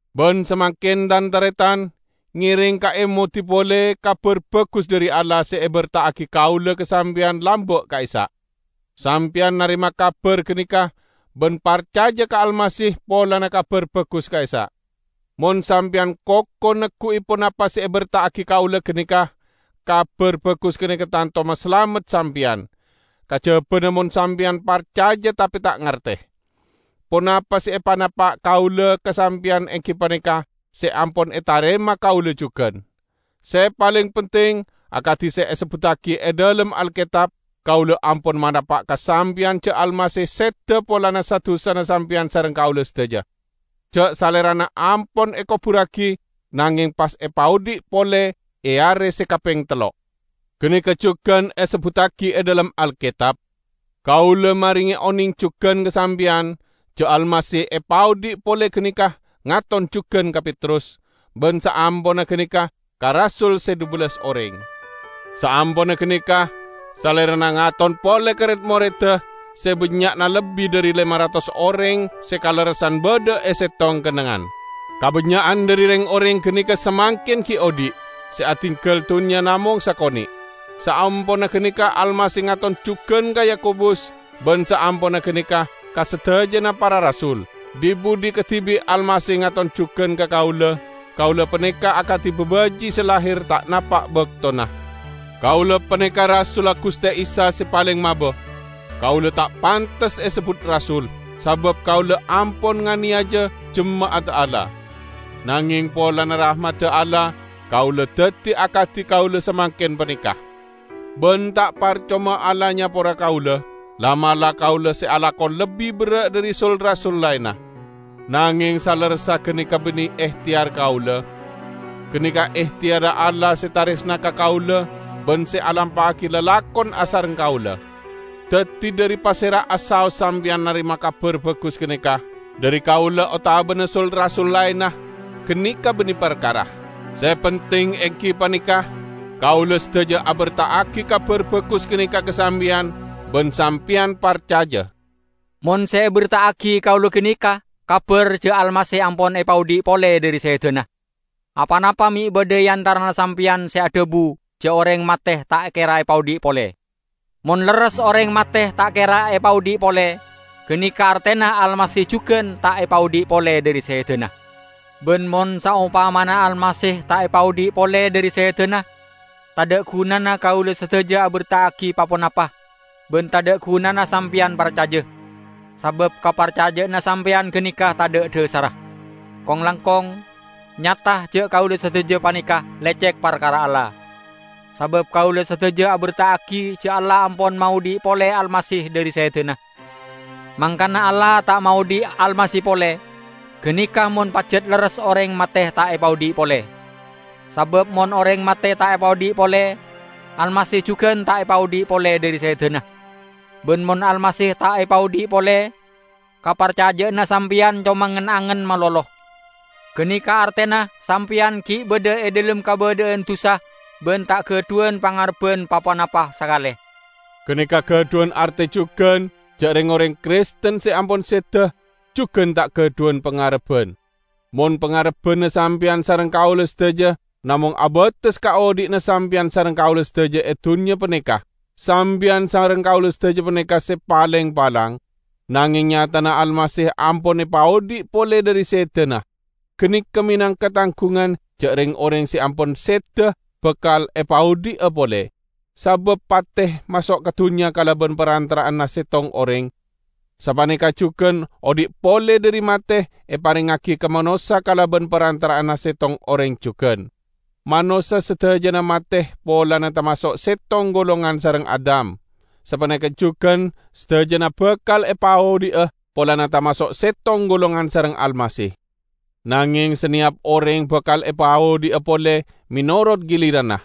Ban samangken, Tan-taretan, ngereng kaemodi pole Kabar Bagus dhari Allah se eberta'agi kaula ka sampeyan lamba' ka'issa'. Sampeyan narema kabar ganeka, ban parcaja ka Almasih polana Kabar Bagus ka'issa'. Mon sampeyan koko neggu'i ponapa se eberta'agi kaula ganeka, Kabar Bagus ganeka tanto masalamet sampeyan; kajabana mon sampeyan parcaja tape ta' ngarte. Ponapa se epanapa' kaula ka sampeyan enggi paneka se ampon etarema kaula jugan. Se paleng penting, akadi se esebbuttagi e dhalem Alketab, kaula ampon manapa' ka sampeyan ja' Almasih seda polana sa-dusana sampeyan sareng kaula sadaja; ja' Salerana ampon ekoburragi nangeng pas epaodhi' pole e are se kapeng tello'. Ganeka jugan esebbuttagi e dhalem Alketab. Kaula marenge oneng jugan ka sampeyan ja' Almasih se epaodhi' pole ganeka ngaton jugan ka Petrus, ban saamponna ganeka ka rasul se dhubellas oreng. Saamponna ganeka Salerana ngaton pole ka red-moredda se bannya'na lebbi dhari lema ratos oreng se kalerressan badha e settong kennengngan. Kabannya'an dhari reng-oreng ganeka samangken gi' odhi', se adinggal dunnya namong sakone'. Saamponna ganeka Almasih ngaton jugan ka Yakobus, ban saamponna ganeka ka sadajana para rasul. Dhi-budhi kadibi' Almasih ngaton jugan ka kaula -- kaula paneka akadi babaji' se lahir ta' napa' baktona! Kaula paneka rasulla Guste Isa se paleng maba. Kaula ta' pantes esebbut rasul, sabab kaula ampon nganeyaja jema'adda Allah. Nangeng polana rahmadda Allah kaula daddi akadi kaula samangken paneka. Ban ta' parcoma Allah nyapora kaula. La'-mala' kaula se alako lebbi berra' dhari sul-rasul laenna. Nangeng salerressa ganeka banne ehteyar kaula; ganeka ehteyarra Allah se taresna ka kaula ban se alampa'agi lalakon asareng kaula. Daddi, dhari pasera'a saos sampeyan narema Kabar Bagus ganeka -- dhari kaula otabana sul-rasul laenna -- ganeka banne parkara. Se penting enggi paneka: kaula sadaja aberta'agi Kabar Bagus ganeka ka sampeyan, ban sampeyan parcaja. Mon se eberta'agi kaula ganeka kabar ja' Almasih ampon epaodhi' pole dhari sedana, aponapa me' badha e antarana sampeyan se adhabu ja' oreng mate ta' kera epaodhi' pole? Mon lerres oreng mate ta' kera epaodhi' pole, ganeka artena Almasih jugan ta' epaodhi' pole dhari sedana. Ban mon saompamana Almasih ta' epaodhi' pole dhari sedana, tadha' gunana kaula sadaja aberta'agi pa-ponapa, ban tadha' gunana sampeyan parcaja, sabab kaparcaja'anna sampeyan ganeka tadha' dhasarra. Kong-langkong, nyata ja' kaula sadaja paneka lecek parkara Allah, sabab kaula sadaja aberta'agi ja' Allah ampon maodhi' pole Almasih dhari sedana, mangkana Allah ta' maodhi' Almasih pole -- ganeka mon pajat lerres oreng mate ta' epaodhi' pole! Sabab mon oreng mate ta' epaodhi' pole, Almasih jugan ta' epaodhi' pole dhari sedana. Ban mon Almasih ta' epaodhi' pole, kaparcaja'anna sampeyan coma ngen-angen malolo; ganeka artena sampeyan gi' badha e dhalem kabadha'an dusa ban ta' gadhuwan pangarebban pa-ponapa sakale. Ganeka gadhuwan arte jugan ja' reng-oreng Kristen se ampon seda, jugan ta' gadhuwan pangarebban. Mon pangarebbanna sampeyan sareng kaula sadaja namong abates ka odhi'na sampeyan sareng kaula sadaja e dunnya paneka, sampeyan sareng kaula sadaja paneka se paleng palang! Nangeng nyatana Almasih ampon epaodhi' pole dhari sedana. Ganeka menangka tanggungan ja' reng-oreng se ampon seda bakal epaodhi'a pole. Sabab pate maso' ka dunnya kalaban parantara'anna settong oreng, sapaneka jugan odhi' pole dhari mate eparengngagi ka manossa kalaban parantara'anna settong oreng jugan. Manossa sadajana mate polana tamaso' settong golongan sareng Adam, sapaneka jugan sadajana bakal epaodhi'a, polana tamaso' settong golongan sareng Almasih. Nangeng saneyap oreng bakal epaodhi'a pole menorot giliranna: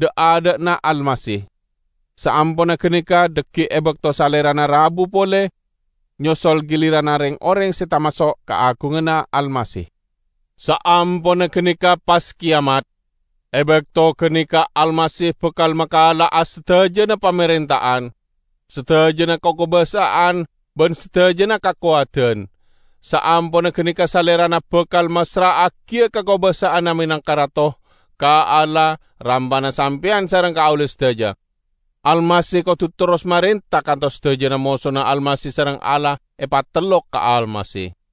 dha'-adha'na Almasih; saamponna ganeka dhaggi' e bakto Salerana rabuwa pole, nyosol giliranna reng-oreng se tamaso' kaagunganna Almasih. Saamponna ganeka pas keyamat. E bakto ganeka Almasih bakal makala'a sadajana pamarenta'an, sadajana kakobasa'an ban sadajana kakowadan; saamponna ganeka Salerana bakal massra'agiya kakobasa'anna menangka Rato, ka Allah, Ramana sampeyan sareng kaula sadaja. Almasih kodu terros marenta kantos sadajana mosona Almasih sareng Allah epatellok ka Almasih.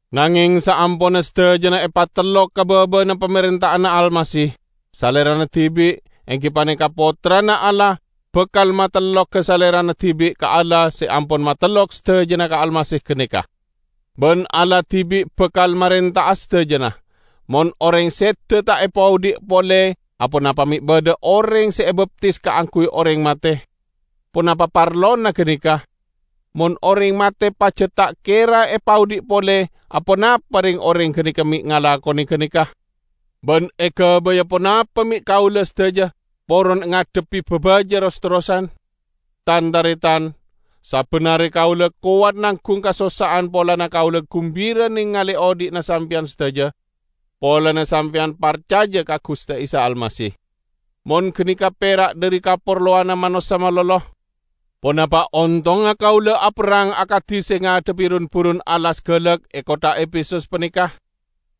Nangeng saamponna sadajana epatellok ka baba'anna pamarenta'anna Almasih, Salerana dibi', enggi paneka Pottrana Allah, bakal matelloga Salerana dibi' ka Allah se ampon matellok sadajana ka Almasih ganeka. Ban Allah dibi' bakal marenta'a sadajana. Mon oreng seda ta' epaodhi' pole, aponapa me' badha oreng se ebaptis kaangguy oreng mate? Ponapa parlona ganeka? Mon oreng mate pajat ta' kera epaodhi' pole, aponapa reng-oreng ganeka me' ngalakone ganeka? Ban egabaya ponapa me' kaula sadaja poron ngadhebbi babaja ros-terrosan? Tan-taretan! Sabban are kaula kowat nanggung kasossa'an polana kaula gumbira nengale odhi'na sampeyan sadaja, polana sampeyan parcaja ka Guste Isa Almasih. Mon ganeka pera' dhari kaparlowanna manossa malolo, ponapa ontongnga kaula aperrang akadi se ngadhebbi run-burun alas galak e kottha Efesus paneka?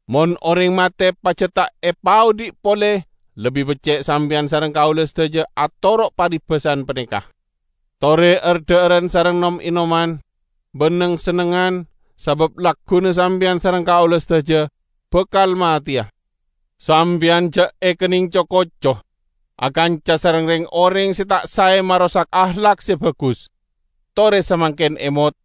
Mon oreng mate pajat ta' epaodhi' pole, lebbi becce' sampeyan sareng kaula sadaja atoro' parebasan paneka, "Tore ar-dha'aran sareng nom-enoman, ban neng-sennengngan, sabab lagguna sampeyan sareng kaula sadaja bakal mateya." Sampeyan ja' ekenneng co-koco! Akanca sareng reng-oreng se ta' sae marosak ahlak se bagus. Tore samangken emot,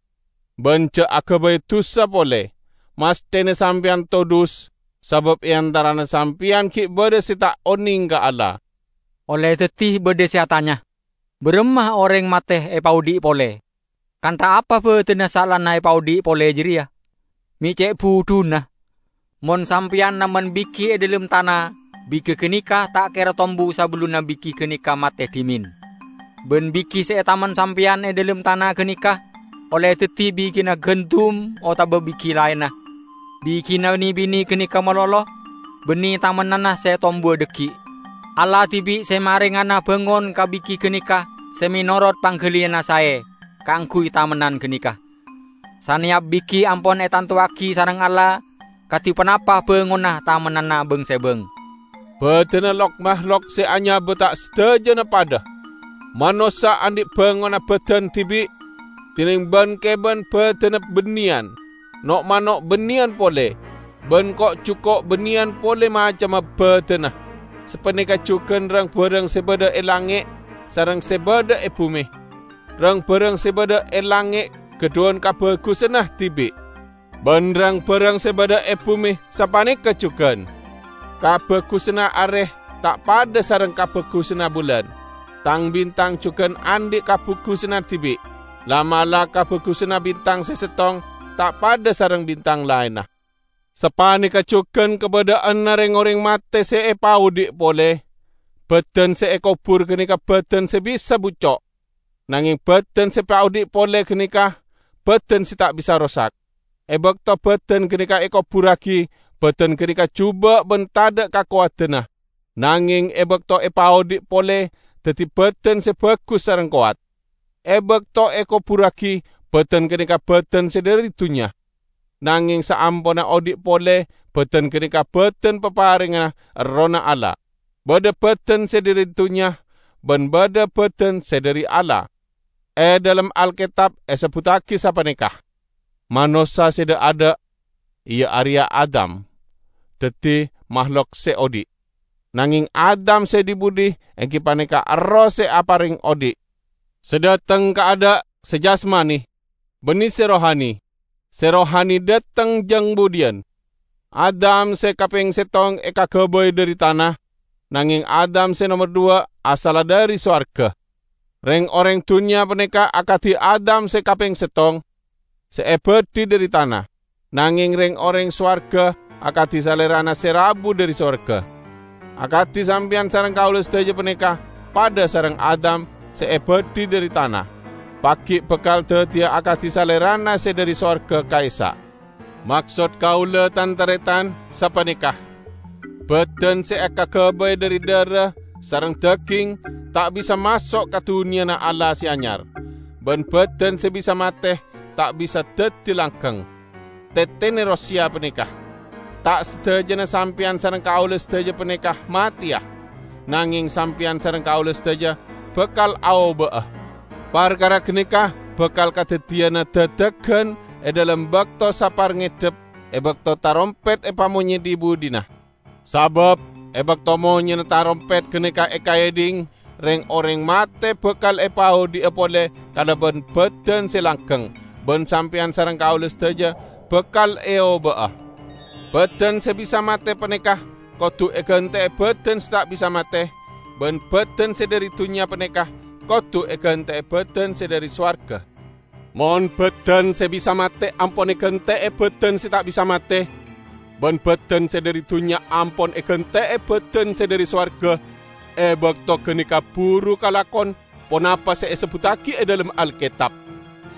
ban ja' agabay dusa pole. Masthena sampeyan todhus, sabab e antarana sampeyan gi' badha se ta' oneng ka Allah. Olle daddi badha se atanya, "Baramma oreng mate epaodhi' pole? Kantha apa badanna saellana epaodhi' pole jareya?" Me' ce' budhuna! Mon Sampeyan namen bigi e dhalem tana, bigi ganeka ta' kera tombu sabellunna bigi ganeka mate dhimen. Ban bigi se etamen sampeyan e dhalem tana ganeka -- olle daddi bigina gandum otaba bigi laenna -- bigina ne-bine ganeka malolo, banne tamennanna se tombuwa dhaggi'. Allah dibi' se marengana bangon ka bigi ganeka se menorot panggaliyanna sae kaangguy tamennan ganeka. Saneyap bigi ampon etantowagi sareng Allah kadi ponapa bangonna tamennanna bang-sebang. Badanna lok-mahlok se anyaba ta' sadajana padha. Manossa andhi' bangonna badan dibi', dineng ban-keban badanna banneyan; no'-mano' banneyan pole, ban ko'-juko' banneyan pole macemma badanna. Sapaneka jugan rang-barang se badha e langnge' sareng se badha e bume. Rang-barang se badha e langnge' gadhuwan kabagusanna dibi', ban rang-barang se badha e bume sapaneka jugan. Kabagusanna are ta' padha sareng kabagusanna bulan. Tang-bintang jugan andhi' kabagusanna dibi'. La'-mala' kabagusanna bintang se settong ta' padha sareng bintang laenna. Sapaneka jugan kabadha'anna reng-oreng mate se epaodhi' pole. Badan se ekobur ganeka badan se bisa bucco', nangeng badan se epaodhi' pole ganeka badan se ta' bisa rosak. E bakto badan ganeka ekoburragi, badan ganeka juba' ban tadha' kakowadanna; nangeng e bakto epaodhi' pole, daddi badan se bagus sareng kowat. E bakto ekoburragi, badan ganeka badan se dhari dunnya; nangeng saamponna odhi' pole, badan ganeka badan paparengnga Errohna Allah. Badha badan se dhari dunnya, ban badha badan se dhari Allah. E dhalem Alketab esebbuttagi sapaneka, "Manossa se dha'-adha', iya areya Adam, daddi mahlok se odhi'," nangeng Adam se dhi-budhi enggi paneka Erroh se apareng odhi'. Se dhateng kaadha' se jasmani, banne se rohani. Se rohani dhateng jang budhiyan. Adam se kapeng settong ekagabay dhari tana, nangeng Adam se nomer dhuwa' asalla dhari sowarga. Reng-oreng dunnya paneka akadi Adam se kapeng settong, se ebadhi dhari tana, nangeng reng-oreng sowarga akadi Salerana se rabu dhari sowarga. Akadi sampeyan sareng kaula sadaja paneka padha sareng Adam se ebadhi dhari tana, pagi' bakal daddiya akadi Salerana se dhari sowarga ka'issa'. Maksod kaula, tan-taretan, sapaneka: badan se ekagabay dhari dhara sareng daging, ta' bisa maso' ka Dunnyana Allah Se Anyar; ban badan se bisa mate ta' bisa daddi langgeng. Tetene roseya paneka: Ta' sadajana sampeyan sareng kaula sadaja paneka mateya, nangeng sampeyan sareng kaula sadaja bakal aoba'a. Parkara ganeka bakal kadaddiyana dadagan e dhalem bakto saparngedep, e bakto tarompet epamonye dhi-budhina. Sabab e bakto monyena tarompet ganeka ekaedhing, reng-oreng mate bakal epaodhi'a pole kalaban badan se langgeng, ban sampeyan sareng kaula sadaja bakal eoba'a. Badan se bisa mate paneka kodu egante'e badan se ta' bisa mate, ban badan se dhari dunnya paneka kodu egante'e badan se dhari sowarga. Mon badan se bisa mate ampon egante'e badan se ta' bisa mate, ban badan se dhari dunnya ampon egante'e badan se dhari sowarga, e bakto ganeka buru kalakon ponapa se esebbuttagi e dhalem Alketab,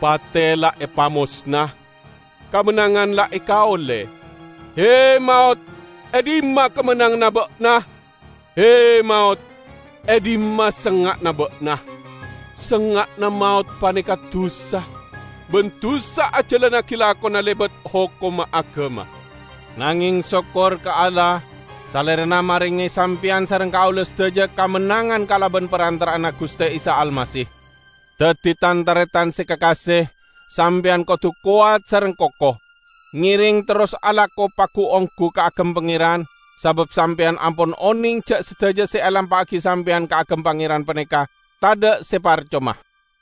"Pate la epamosna; kamennangan la ekaolle!" "He, maot, e dhimma kamennanganna ba'na? He, maot, e dhimma sengnga'na ba'na?" Sengnga'na maot paneka dusa, ban dusa ajalannagi lakona lebat hokomma agama. Nangeng sokkor ka Allah; Salerana marenge sampeyan sareng kaula sadaja kamennangan kalaban parantara'anna Guste Isa Almasih! Daddi, tan-taretan se kakase! Sampeyan kodu kowat sareng koko. Ngereng terros alako pagu-onggu kaagem Pangeran, sabab sampeyan ampon oneng ja' sadaja se elampa'agi sampeyan kaagem Pangeran paneka tadha' se parcoma.